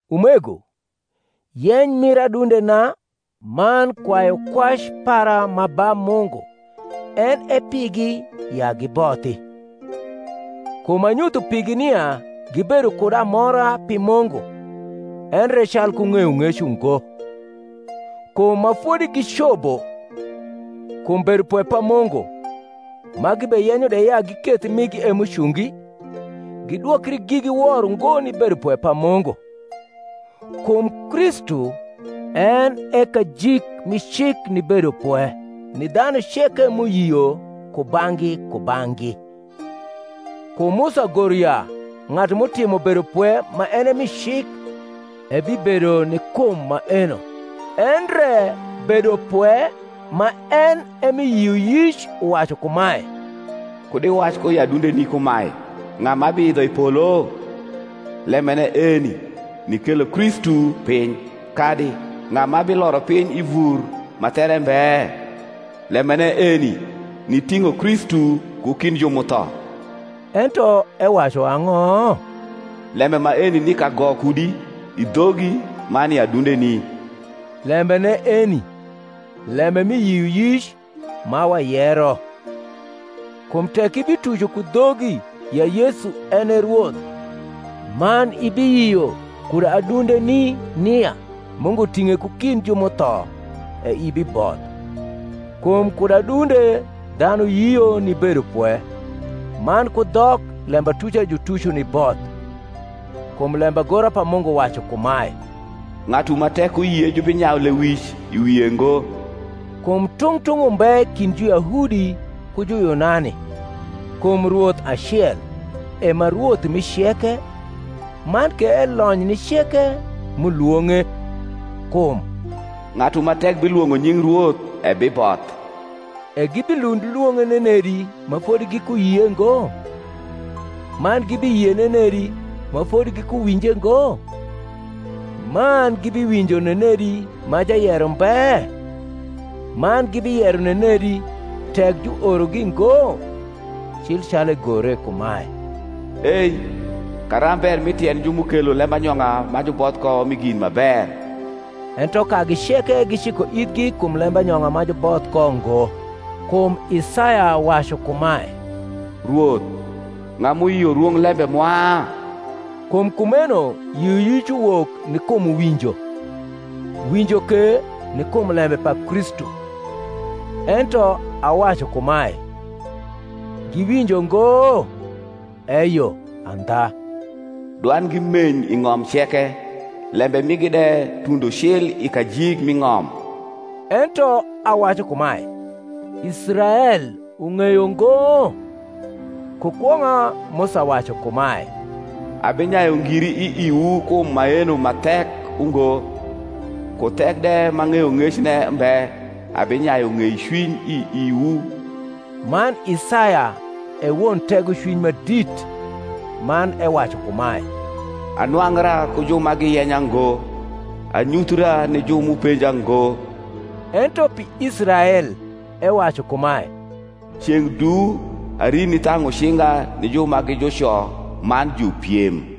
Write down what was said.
Umego, yeny mir adundena man kwayukwac para ma ba Mungu en e pigi, ya gibothi. Kum anyutho pigi nia gibedo kud amora pi Mungu, endre calku ng’eyong’ec ungo. Kum ma fodi gi cobo kum bedopwe pa Mungu, ma gibeyenyo de ya giketh migi e m’ucungi, gidwokri gigi wor ungo ni bedopwe pa Mungu. Kum Kristu en e kajik mi cik ni bedopwe ni dhanu ceke m’uyio kubang’gi kubang’gi. Kum Musa goro ya ng’atu m’utimo bedopwe ma en e mi cik ebibedo ni kum maeno. Endre bedopwe ma en e mi yioyic uwacu kumae, Kud iwac ku i adundeni kumae, Ng’a ma biidho i polo? (lembene eni, nikelo Kristu piny:) kadi, Ng’a ma biloro piny i vur ma there mbe? (lembene eni, niting’o Kristu ku kind ju m’utho). Ento ewacu ang’o? Lembe maeni ni kago kudi, i dhogi, man i adundeni: lembene eni, lembe mi yioyic, ma wayero: kum tek ibituco ku dhogi ya Yesu en e Rwoth, man ibiyio kud adundeni nia Mungu ting’e ku kind ju m’utho, e ibiboth: kum kud adunde dhanu yio ni bedopwe; man ku dhok lembatuca jutuco ni both. Kum lembagora pa Mungu wacu kumae, Ng’atu ma tek uyie jubinyayu lewic i wie ngo. Kum tung’ tung’ umbe kind Juyahudi ku Juyunani: kum Rwoth acel e ma Rwoth mi ceke man ke elony ni ceke m’ulwong’e; kum, Ng’atu ma tek bilwong’o nying Rwoth ebiboth. E gibilund lwong’e nenedi ma fodi gikuyie ngo? man gibiyie nenedi ma fodi gikuwinje ngo? man gibiwinjo nenedi ma jayero mbe? man gibiyero nenedi, tek juorogi ngo? cil calu egore kumae, Ei karamb ber mi tiend ju m’ukelo lembanyong’a ma juboth ko mi gin ma ber! Ento kagi ceke giciko ithgi kum lembanyong’a ma juboth ko ngo. Kum Isaya wacu kumae, Rwoth, ng’a m’uyio rwonglembe mwa? Kum kumeno yioyic uwok ni kum winjo, winjo ke ni kum lembe pa Kristu. Ento awacu kumae, Giwinjo ngo? Eyo, andha, Dwandgi meny i ng’om ceke, Lembe migi de tundo cil i kajik mi ng’om. Ento awacu kumae, Israel ung’eyo ngo? Ku kwong’a Musa wacu kumae, Abinyayu ngiri i iwu kum maeno ma thek ungo, Ku thek de ma ng’eyong’ecne mbe abinyayu ng’ecwiny i iwu. Man Isaya e won tegocwiny ma dit, man ewacu kumae, Anwangra ku ju ma giyenya ngo; Anyuthra ni ju m’upenja ngo. Ento pi Israel ewacu kumae, Ceng’ du ari nithang’u cinga ni ju ma gi juco man jupiem.